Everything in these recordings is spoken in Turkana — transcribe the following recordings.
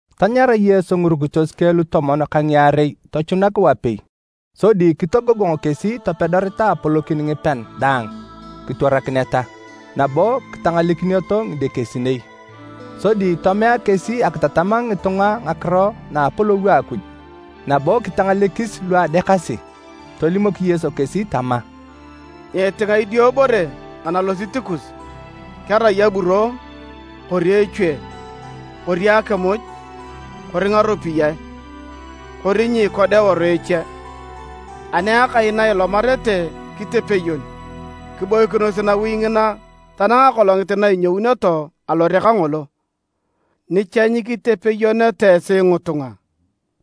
Tanyara Yesu ngirukitos keng lutomon ka ngiarei tochunak wapei, sodi kitogogong kesi topedoreta apolokin ngipean daang kitwarakineta, nabo kitangalekinioto ngidekesinei. Sodi tomea kesi akitatam ngitunga ngakiro na a Apolou a Akuj, nabo kitangalekis lu adeakasi. Tolimok Yesu kesi tama, “Nyiitinga idiobore analosit kus, kerai aburo kori echue kori akimuj kori ngaropiyae kori nyiikoda eworu eche. Ani akai na ilomarete kitepeyon, kiboikinos nawi ngina tanang akolongit na inyounioto alore kangolo, ni cha nyikitepeyoneta esi ngitunga,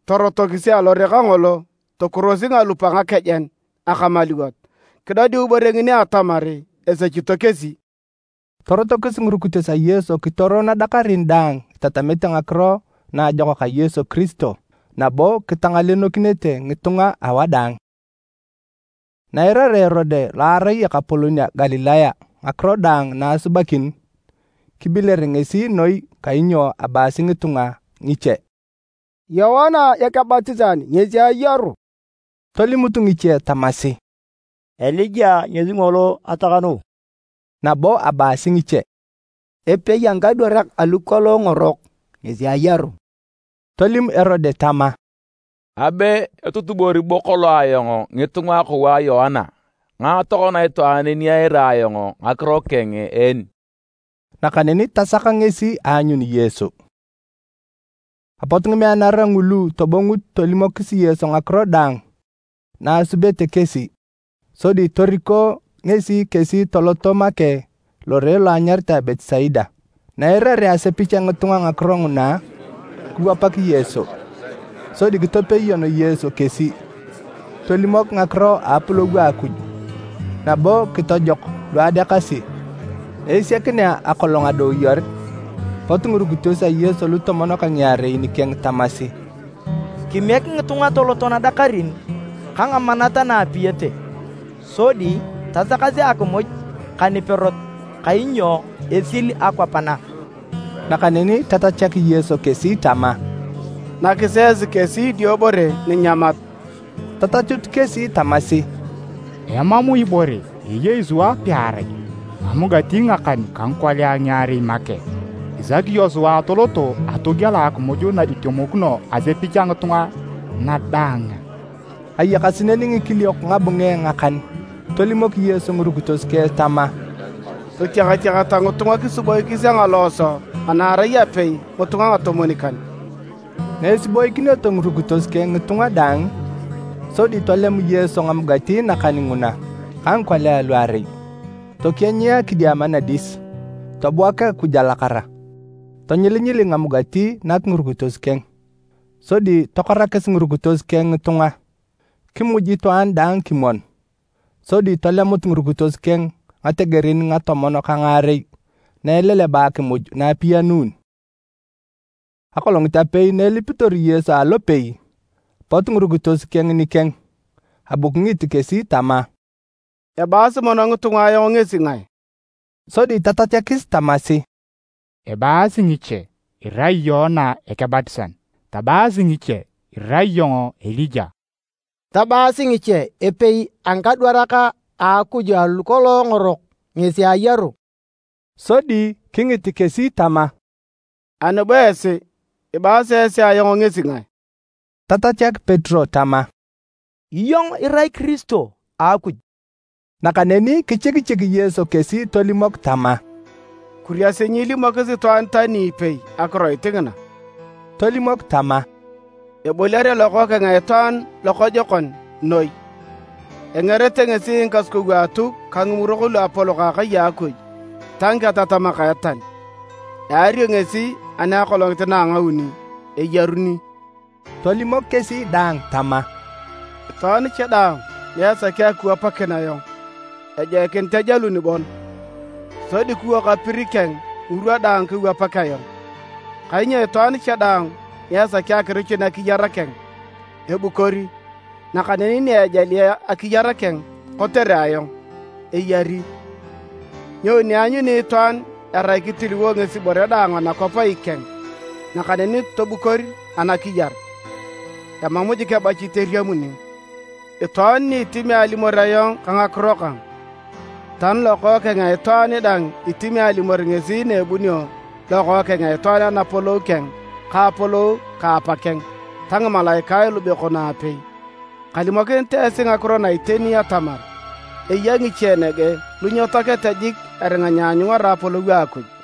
torotokisi alore kangolo tokurosi ngalup a ngakejen akamaluwot kidodiu ibore ngini atamar esechito kesi.” Torotokis ngirukitos a Yesu kitoro nadakarin daang itatamete Ngakiro Naajokak a Yesu Kiristo nabo kitangalenokinete ngitunga awadaang. Na eirarea Erode lo arai ekapolon a Galilaya ngakiro daang na asubakin, kibiler ngesi noi kainyo abaasi ngitunga ngiche, “Yoana Ekebatisan ngesi ayaru!” Tolimut ngiche tamasi, “Elija ngesi ngolo atakanuu,” nabo abaasi ngiche, “Epei a ngikadwarak alu kolong ngorok ngesi ayaru.” Tolim Erode tama, “Abe etutubori bo kolong ayong ngitunga akou a Yoana. Ngae tokona itwaan ni eira ayong ngakiro keng en?” Nakaneni tasak ngesi aanyun Yesu. Apot ngimeanara ngulu tobongut tolimokis Yesu ngakiro daang na asubete kesi. Sodi toriko ngesi kesi toloto make lore lo anyaritae Betisaida. Na eirarea asepich a ngitunga ngakiro nguna, kiwapak Yesu. Sodi kitepeyon Yesu kesi, tolimok ngakiro na a Apolou a Akuj, nabo kitojok lu adeakasi. Na esiakinea akolong adooyor, pot ngirukitos a Yesu lutomon ka ngiarei nikeng tamasi, “Kimiek ngitunga toloto nadakarin ka ngamanat na aapiyete, sodi tasakasi akimuj ka niperot, kainyo esil akwap na.” Nakaneni tatachak Yesu kesi tama, “Nakisi esi kesi idiobore ninyamat.” Tatachut kesi tamasi, “Emam ibore eyei sua pearai ngamugati ngakan ka ngikolia ngiarei make. Isaki iyong sua atoloto atogiela akimuj na itemokino asepich a ngitunga na daang a?” ( Ayakasi neni ngikiliok ngabunge ngakan.) Tolimok Yesu ngirukitos keng tama, “Totiakatiakata ngitunga kisiboikis a ngalooso ana erai apei ngitunga ngitomwon-kan.” Na esiboikineto ngirukitos keng ngitunga daang, sodi tolem Yesu ngamugati nakan nguna ka ngikolia luarei, tokienyia kidiama nadis, tobuak Akuj alakara, tonyilinyili ngamugati nak ngirukitos keng, sodi tokorakis ngirukitos keng ngitunga. Kimuj itwaan daang kimwon, sodi tolemut ngirukitos keng ngategerin ngatomon ka ngaarei na eleleba akimuj na apiyanun. Akolongit apei na elipitor Yesu alopei, pot ngirukitos keng nikeng. Abu kingit kesi tama, “Ebaasi mono ngitunga ayong ngesi ngae?” Sodi tatachakis tamasi, “Ebaasi ngiche irai Yoana Ekebatisan, tabaasi ngiche irai iyong Elija, tabaasi ngiche epei a ngikadwarak a Akuj alu kolong ngorok ngesi ayaru!” Sodi kingit kesi tama, “Ani bo esi, ibaasi esi ayong ngesi ngae?” Tatachak Petero tama, “Iyong irai Kiristo a Akuj!” Nakaneni kichikichik Yesu kesi tolimok tama, “Kuriasi nyiilimokis itwaan tani ipei akiroit ngina.” Tolimok tama, “Eboliare Lokookeng a Itwaan lokojokon noi. Engerete ngesi ngikasukou a Atuk ka Ngimurok Luapolok a akai Akuj ta ngiketatamak a etal. Eario ngesi ani akolongit na ngauni, eyaruni.” Tolimok kesi daang tama, “Itwaan cha daang ni esaki akiwapakin ayong, ejoikinit ejalun bon, sodi kiwok apir keng ngirwa daang kewapak ayong. Kainyo itwaan daang ni esaki akirichun akiyar keng, ebukori, nakaneni ni ejali akiyar keng kotere ayong, eyari. Nyoni eanyuni itwaan erai kitiliwo ngesi ibore daang anakwap ikeng nakaneni tobukor anakiyar? Emam jik ebachit eriamuni! Itwaan ni itimi alimor ayong ka ngakiro kang, tani Lokookeng a Itwaan dang itimi alimor ngesi na ebunio Lokookeng a Itwaan Anapolou keng ka Apolou ka Apakeng ta ngimalaikae lubekon aapei. Kalimokinit esi ngakiro na iteni atamar, eya ngiche nege lu nyetoakete jik eringa nyeanyungara Apolou a Akuj.”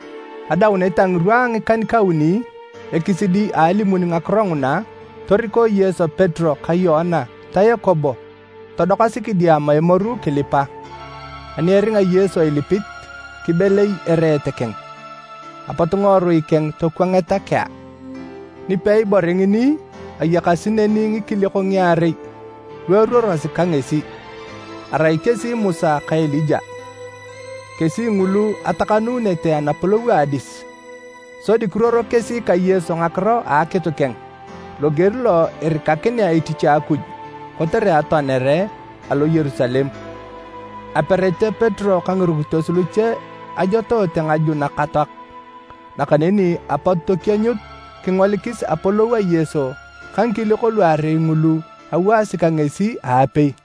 Adaunet a ngirwa a ngikan-kauni, ekisidi a alimuni ngakiro nguna, toriko Yesu Petero ka Yoana ta Yakobo todokasi kidiama emoru kilipa. Ani eringa Yesu ilipit, kibelei ereet keng, apot ngiworui keng tokwangeta kea. Nipei bore ngini, ayakasi neni ngikiliok ngiarei lu eruorosi ka ngesi, arai kesi Musa ka Elija. Kesi ngulu atakanuunete anapolou a adis, sodi kiruoro kesi ka Yesu ngakiro a akitu keng loger lo irikakinea etich a Akuj kotere atoanere alo Yerusalem. Aperete Petero ka ngirukitos luche ajotoote ngaju nakatoak, nakaneni apot tokienyut kingolikis apolou a Yesu ka ngikiliok luarei ngulu ewaasi ka ngesi aapei.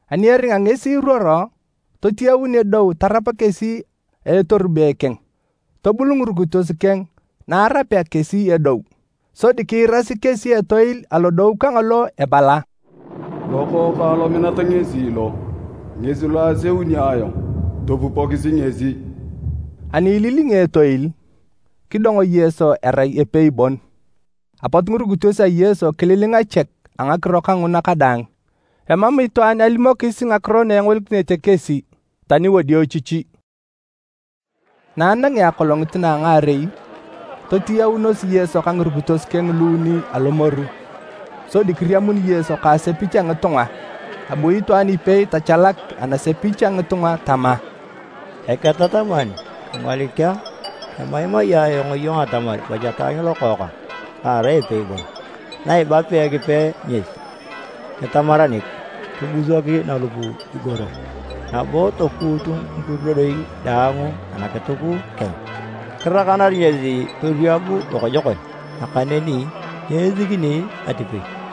Ani eringa ngesi iruoro, totiyaun edou tarap kesi a etorube keng. Tobul ngirukitos keng na arapea kesi edou. Sodi kiirasi kesi etoil alodou kangolo ebala, “Lokookang lominat ngesi lo, ngesi lo aseuni ayong, topupokisi ngesi!” Ani ililingi etoil, kidong Yesu erai epei bon. Apot ngirukitos a Yesu kililinga chek a ngakiro kanguna kadaang. Emam itwaan alimokis ngakiro na engolikinete kesi, tani wadiochichi. Na anangea akolongit na a ngaarei, totiyaunos Yesu ka ngirukitos keng luuni alomoru, sodi kiriamun Yesu ka asepich a ngitunga. Abu itwaan ipei tachalak anasepich a ngitunga tama, “Eketataman, kingolik a, kemaimai iyong atamar bu cha taanyu lokookang, lo erai epei bon! Na ebapea Ekipe ngesi, kitamaranik, kibusok nalup igoro, nabo tokuut ngikurudoi dang anakituk keng, kirakanar ngesi torieb lokojokon, nakaneni nyeisikini atipei!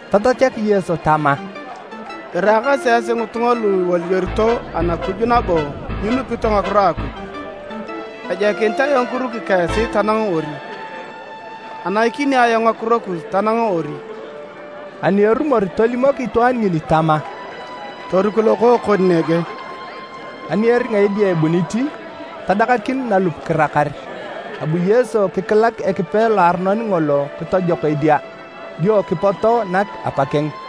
Tatachak Yesu tama, “Iraakasi esi ngitunga lu iwoliorito Anakuj nabo nyinupito ngakiro a Akuj! Ejoikinit ayong kiruki ka esi tanang ori? Anaikini ayong ngakiro kus tanang ori?” Ani erumor tolimok itwaan ngini tama, “Toriku lokookon nege.” Ani eringa edia ebunit, tadakakin nalup kirakar. Abu Yesu kikilak Ekipe loaronon ngolo kitojok edia, dio kipoto nak apakeng.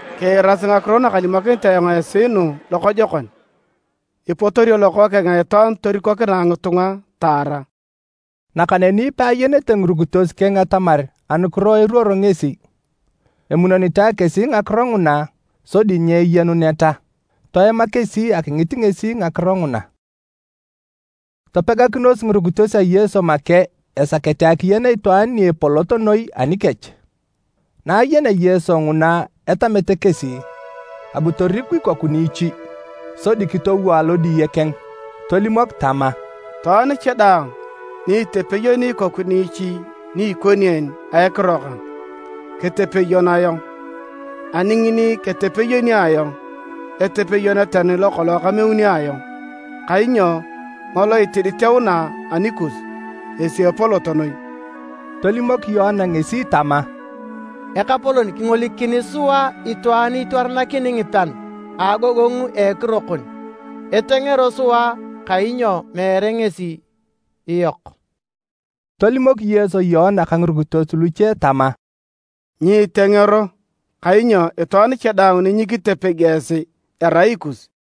“Kiirasi ngakiro nakalimokinit ayong esi nu lokojokon! Ipotorio Lokookeng a Itwaan torikokinae ngitunga taara.” Nakaneni peayenete ngirukitos keng atamar anukiro eruoro ngesi. Emunonitae kesi ngakiro nguna sodi nyeyenuneta, toema kesi akingit ngesi ngakiro nguna. Ngae epolot noi? Topegakinos ngirukitos a Yesu make esakete akiyen itwaan ni epolot noi anikech. Na ayenea Yesu nguna etamete kesi, abu toriku ikoku niichi, sodi kitowo alodiye keng, tolimok tama, “Itwaan cha daang ni itepeyoni ikoku niichi ni ikoni en a ekiro kang, ketepeyon ayong, ani ngini ketepeyoni ayong, etepeyon tani lokolong kameuni ayong. Kainyo ngolo itiditeuna anikus, ngesi epolot noi.” Tolimok Yoana ngesi tama, “Ekapolon, kingolikini sua itwaan itwaranakini ngipean a agogongu a ekiro kon, etengero sua kainyo meere ngesi iyok.” Tolimok Yesu Yoana ka ngirukitos luche tama, “Nyiitengero kainyo itwaan cha daang ni nyikitepegi esi erai ikus.”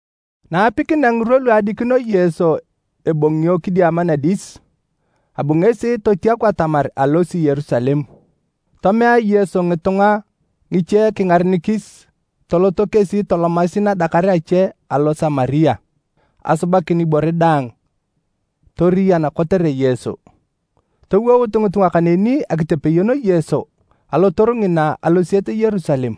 Na apikinea ngirwa lu adikino Yesu ebongio kidiama nadis, abu ngesi totiaku atamar alosi Yerusalem. Tomea Yesu ngitunga ngiche kingarenikis toloto kesi tolomasi nadakar ache alo Samaria, asubakin ibore daang toriyan kotere Yesu. Towout ngitunga kaneni akitepeyon Yesu alotoru ngina alosiet Yerusalem.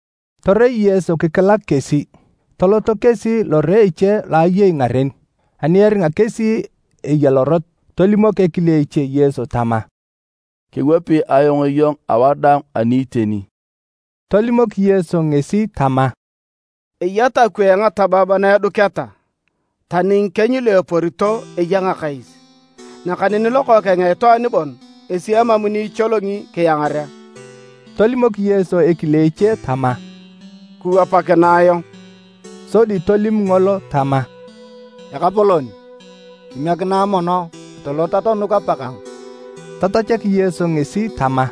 Torei Yesu kikilak kesi. Toloto kesi lore eche lo ayei ngaren. Ani eringa kesi eya lorot, tolimok ekile eche Yesu tama, “Kewapi ayong iyong awadaang ani iteni.” Tolimok Yesu ngesi tama, “Eya takwee ngatabab na eduketa, tani ngikieny lu eporito eya ngakais, nakaneni Lokookeng a Itwaan bon ngesi emam ni icholongi kiangarea.” Tolimok Yesu ekile eche tama, “Kiwapakinae ayong.” Sodi tolim ngolo tama, “Ekapolon, kimiekinae mono atolot atonuk apakang.” Tatachak Yesu ngesi tama,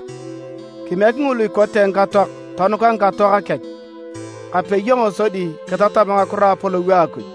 “Kimiek ngulu ikote ngikatoak tonuka ngikatoak kech. Kape iyong sodi kitatam ngakiro a Apolou a Akuj.”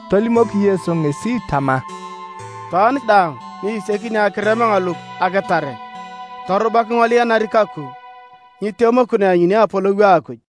Tolimok Yesu ngesi tama, “Itwaan daang ni isiakini akirem ngalup akitare, torubak ingolianari kaku, nyitemokino eanyuni Apolou a Akuj.”